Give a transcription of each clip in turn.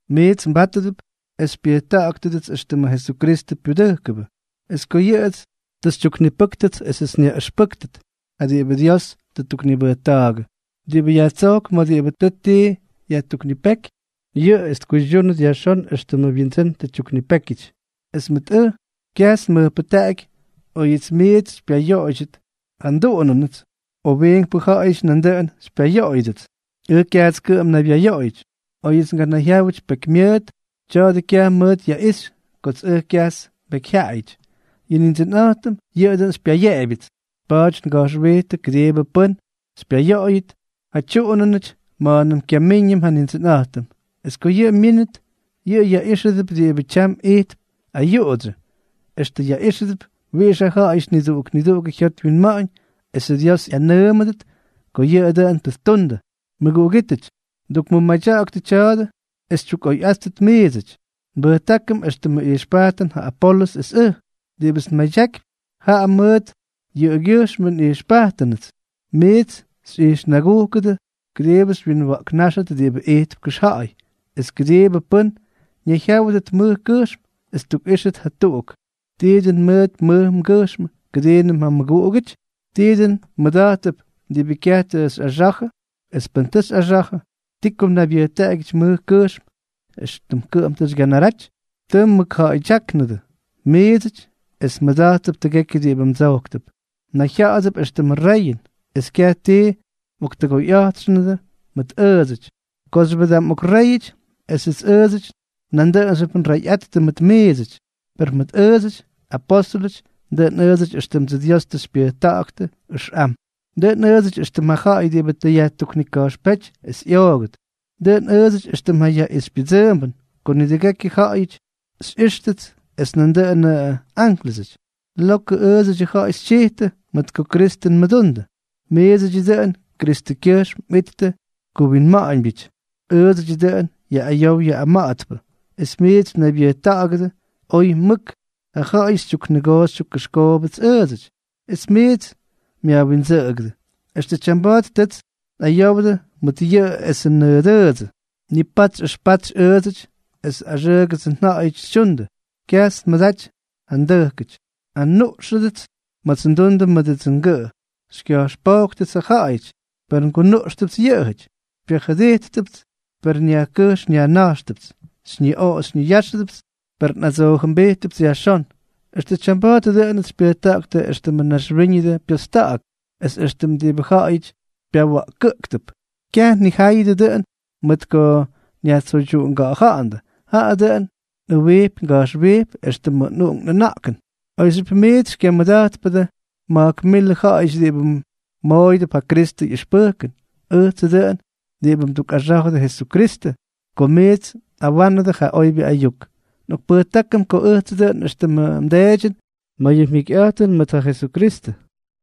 Miits mbátʉdʉp es xypyʉjta̱ꞌa̱ktʉdʉts éxtʉmʉ Jesukristʉ pyudʉjkʉbʉ, es ko yʉꞌʉts tʉ xytyuknipʉ́ktʉts esʉts nyaꞌʉxpʉ́kʉt ja diꞌibʉ Dios tʉ ttuknibʉjta̱a̱gʉ. Diꞌibʉ yajtsojkp ma̱ diꞌibʉ tʉ tii yajtuknipéky, yʉꞌʉ es tkuydyúnʉt yajxón éxtʉmʉ wyindsʉ́n tʉ tyuknipékyʉty. Es mʉt ʉj, kyajts nmʉjpʉjtaꞌaky óyʉts miits xypyayoꞌoydyʉt ja nduꞌunʉnʉts, o wiinkpʉ ja̱ꞌa̱yʉdyʉts nandʉꞌʉn xypyayoꞌoydyʉdʉts. Ʉj kyajts kʉꞌʉm nnaybyayoꞌoyʉty. Oyʉts nganayjyáwʉty pekymyʉʉt, tya̱a̱dʉ kyaj mʉʉt yaꞌixy kots ʉj kyajts nbekyjyaꞌayʉty; yʉ Nindsʉnꞌa̱jtʉm yʉꞌʉ dʉꞌʉn xypyayeꞌebyʉts. Pa̱a̱ty nga̱jxwijtʉ kʉdiibʉ pʉ́n xypyayoꞌoyʉt ja tyuꞌunʉnʉty ma̱a̱nʉm kyamíññʉm ja Nindsʉnꞌa̱jtʉm. Es ko yʉꞌʉ myínʉt, yʉꞌʉ yaꞌíxʉdʉp diꞌibʉ tyam ijtp ayuꞌudsyʉ, extʉ yaꞌíxʉdʉp wiꞌix ja ja̱ꞌa̱yʉty niduꞌuk niduꞌugʉ jyot wyinma̱ꞌa̱ñ, esʉ Dios ꞌyanʉʉmʉdʉt ko oyʉ dʉꞌʉn tʉ ttundʉ. Mʉguꞌugítʉty, ndukmʉmadya̱ꞌa̱ktʉ tya̱a̱dʉ es xytyukꞌoyꞌáttʉt miidsʉty. Nbʉjtákʉm éxtʉmʉ ijxpajtʉn ja Apolʉs es ʉj. Diꞌibʉts nmadyakypy, jaꞌa mʉt yʉꞌʉgyʉjxmʉ nꞌijxpajtʉnʉts miits xyꞌijxnagúkʉdʉt kʉdiibʉ xywyinwa̱ꞌknáxtʉt diꞌibʉ ijtp kʉxja̱ꞌa̱y, es kʉdiibʉ pʉ́n ñayjyáwʉdʉt mʉj kʉjxm es tꞌʉxtíjʉt jatuꞌuk. ¿Tii dʉn mʉʉt mmʉj mgʉjxmʉ kʉdiinʉm ja mmʉguꞌugʉty? ¿Tii dʉn mmʉda̱jttʉp diꞌibʉ kyaj tʉ xyꞌaxa̱jʉ? Es pʉn tʉ xyꞌaxa̱jʉ, ¿ti ko mnaybyʉjtaꞌagyʉty mʉj kʉjxm, éxtʉm kʉꞌʉm tʉ xygyanaraty? Tʉ mmʉkja̱ꞌa̱ydyáknʉdʉ miidsʉty es mmʉda̱jttʉp tʉgekyʉ diꞌibʉ mdsojktʉp. Mnayjya̱ꞌa̱dʉp éxtʉmʉ reyʉn, es kyaj ti mꞌoktʉgoyꞌa̱jtxʉndʉ mʉt ʉʉdsʉty. ¡Kooxyʉbʉ da mꞌokréyʉty esʉts ʉʉdsʉty nandʉꞌʉnxyʉp nreyꞌattʉ mʉt miidsʉty! Per mʉt ʉʉdsʉty, apóstʉlʉty, dʉꞌʉn ʉʉdsʉty éxtʉmdsʉ Dios tʉ xypyʉjta̱ꞌa̱ktʉ ʉxꞌam. Dʉꞌʉn ʉʉdsʉty éxtʉm ja ja̱ꞌa̱y diꞌibʉ tʉ yajtuknika̱jxpéty es ꞌyoogʉt. Dʉꞌʉn ʉʉdsʉty éxtʉm yaꞌixypyʉdsʉʉmbʉn ko nidʉgekyʉ ja̱ꞌa̱yʉty xyꞌíxʉdʉts es nandʉꞌʉnʉ ánklʉsʉty. Lokʉ ʉʉdsʉty ja̱ꞌa̱y xytyijtʉ, mʉt kotsʉ Kristʉ nmʉdundʉ; ¡miidsʉty dʉꞌʉnʉty Kristʉkyʉjxm mꞌittʉ kuwinma̱ꞌa̱ñbyʉty! Ʉʉdsʉdyʉ dʉꞌʉn yaꞌꞌayow yaꞌꞌama̱ꞌa̱tpʉ, es miits mnaybyʉjta̱ꞌa̱gʉdʉ oy mʉk. Ja ja̱ꞌa̱yʉty xytyuknʉgoo xytyukkʉxkoobʉts ʉʉdsʉty, es miits myajwindsʉꞌʉgʉdʉ. Extʉ tyamba̱a̱t tʉts nꞌayowdʉ mʉdʉ yuu esʉ nʉdʉʉdsʉ, nipatsy ʉxpatsy ʉʉdsʉty es axʉʉgʉdsʉ ja̱ꞌa̱yʉty xytyundʉ. Kyajts nmʉdaty ja ndʉjkʉty. Anuꞌxʉdʉts ma̱ts ndundʉ mʉdʉdsʉ ngʉꞌʉ. Xykya̱jxpóktʉts ja ja̱ꞌa̱yʉty, per ngunuꞌxtʉpts yʉꞌʉjʉty. Xypyajʉdijttʉpts, per nyajkʉjx nyajna̱jxtʉpts. Xyñiꞌoꞌo xyñiyáxʉdʉpts, per nꞌadsoojʉmbijttʉpts yajxón. Extʉ tyamba̱a̱t dʉꞌʉnʉts xypyʉjta̱ꞌa̱ktʉ éxtʉmʉ naxwíñʉdʉ pyosta̱ꞌa̱k es éxtʉm diꞌibʉ ja̱ꞌa̱yʉty pyawa̱ꞌkʉꞌktʉp. Kyaj nnijáyʉdʉ dʉꞌʉn mʉt ko nyajtsoydyuꞌunga̱ꞌa̱ja̱ꞌa̱ndʉ, jaꞌa dʉꞌʉn nꞌʉwijpy nga̱jxwijpy éxtʉmdsʉ nꞌuꞌunk nꞌʉna̱ꞌkʉn. Oyxyʉp miits xymyʉda̱jtpʉdʉ ma̱jk milʉ ja̱ꞌa̱yʉty diꞌibʉ mmooyʉdʉp ja Kristʉ ꞌyʉxpʉjkʉn, ʉjtsʉ dʉꞌʉn diꞌibʉ mdukꞌaxá̱jʉdʉ Jesukristʉ ko miits nꞌawa̱ꞌa̱nʉdʉ ja oybyʉ ayuk. Nꞌokpʉjtákʉm ko ʉjtsʉ dʉꞌʉn éxtʉmʉ mdeedyʉn ma̱ yʉ mjikyꞌa̱jtʉn mʉt ja Jesukristʉ.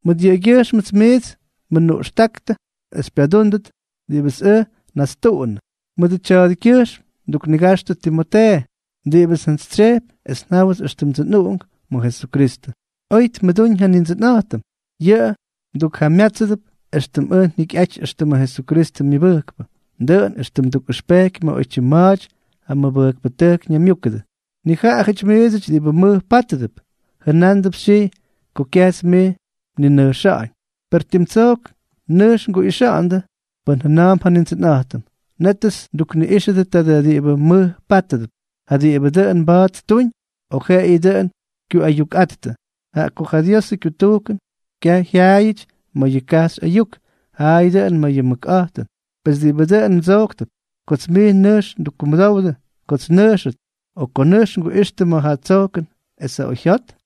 Mʉt yʉꞌʉgyʉjxmts miits nmʉnuꞌxta̱ꞌa̱ktʉ es xypyadúndʉt diꞌibʉts ʉj tʉ nnastunʉ. Mʉdʉ tya̱a̱dʉkyʉjxm nduknigaxtʉ Timotee, diꞌibʉts njantsytsyejpy es njáwʉts éxtʉmdsʉ nꞌuꞌunk ma̱ Jesukristʉ. Oy tmʉdúñ ja Nindsʉnꞌa̱jtʉm. Yʉꞌʉ mdukjamyátsʉdʉp éxtʉmts ʉj njikyꞌaty éxtʉmʉ Jesukristʉ myʉbʉjkpʉ, dʉꞌʉn éxtʉm ndukꞌʉxpejky ma̱ oytyim ma̱a̱ty ja mʉbʉjkpʉtʉjk ñaymyúkʉdʉ. Nijaꞌajʉty miidsʉty diꞌibʉ mʉj pátʉdʉp, jʉnándʉp xytyijy ko kyajts mij nninʉjxa̱ꞌa̱ñ. Per tim tsojk nʉjx nguꞌixa̱ꞌa̱ndʉ pʉn jʉna̱a̱mp ja Nindsʉnꞌa̱jtʉm, nétʉts ndukniꞌíxʉdʉ taadʉ diꞌibʉ mʉj pátʉdʉp, ja diꞌibʉ dʉn mba̱a̱t ttuñ o jeꞌeyʉ dʉꞌʉn kyuꞌayukꞌatyꞌattʉ. Jaꞌa ko ja Diosʉ kyutujkʉn, kyaj jyaayʉty ma̱ ja kajxy ayuk, jaꞌa dʉꞌʉn ma̱ ja mʉkꞌa̱jtʉn. Pes, ¿diꞌibʉ dʉn mdsojktʉp, kots mij nʉjx ndukkumʉdowdʉ kots nnʉjxʉt, o ko nʉjx nguꞌixtʉ mʉt ja tsojkʉn es ja oyjyot?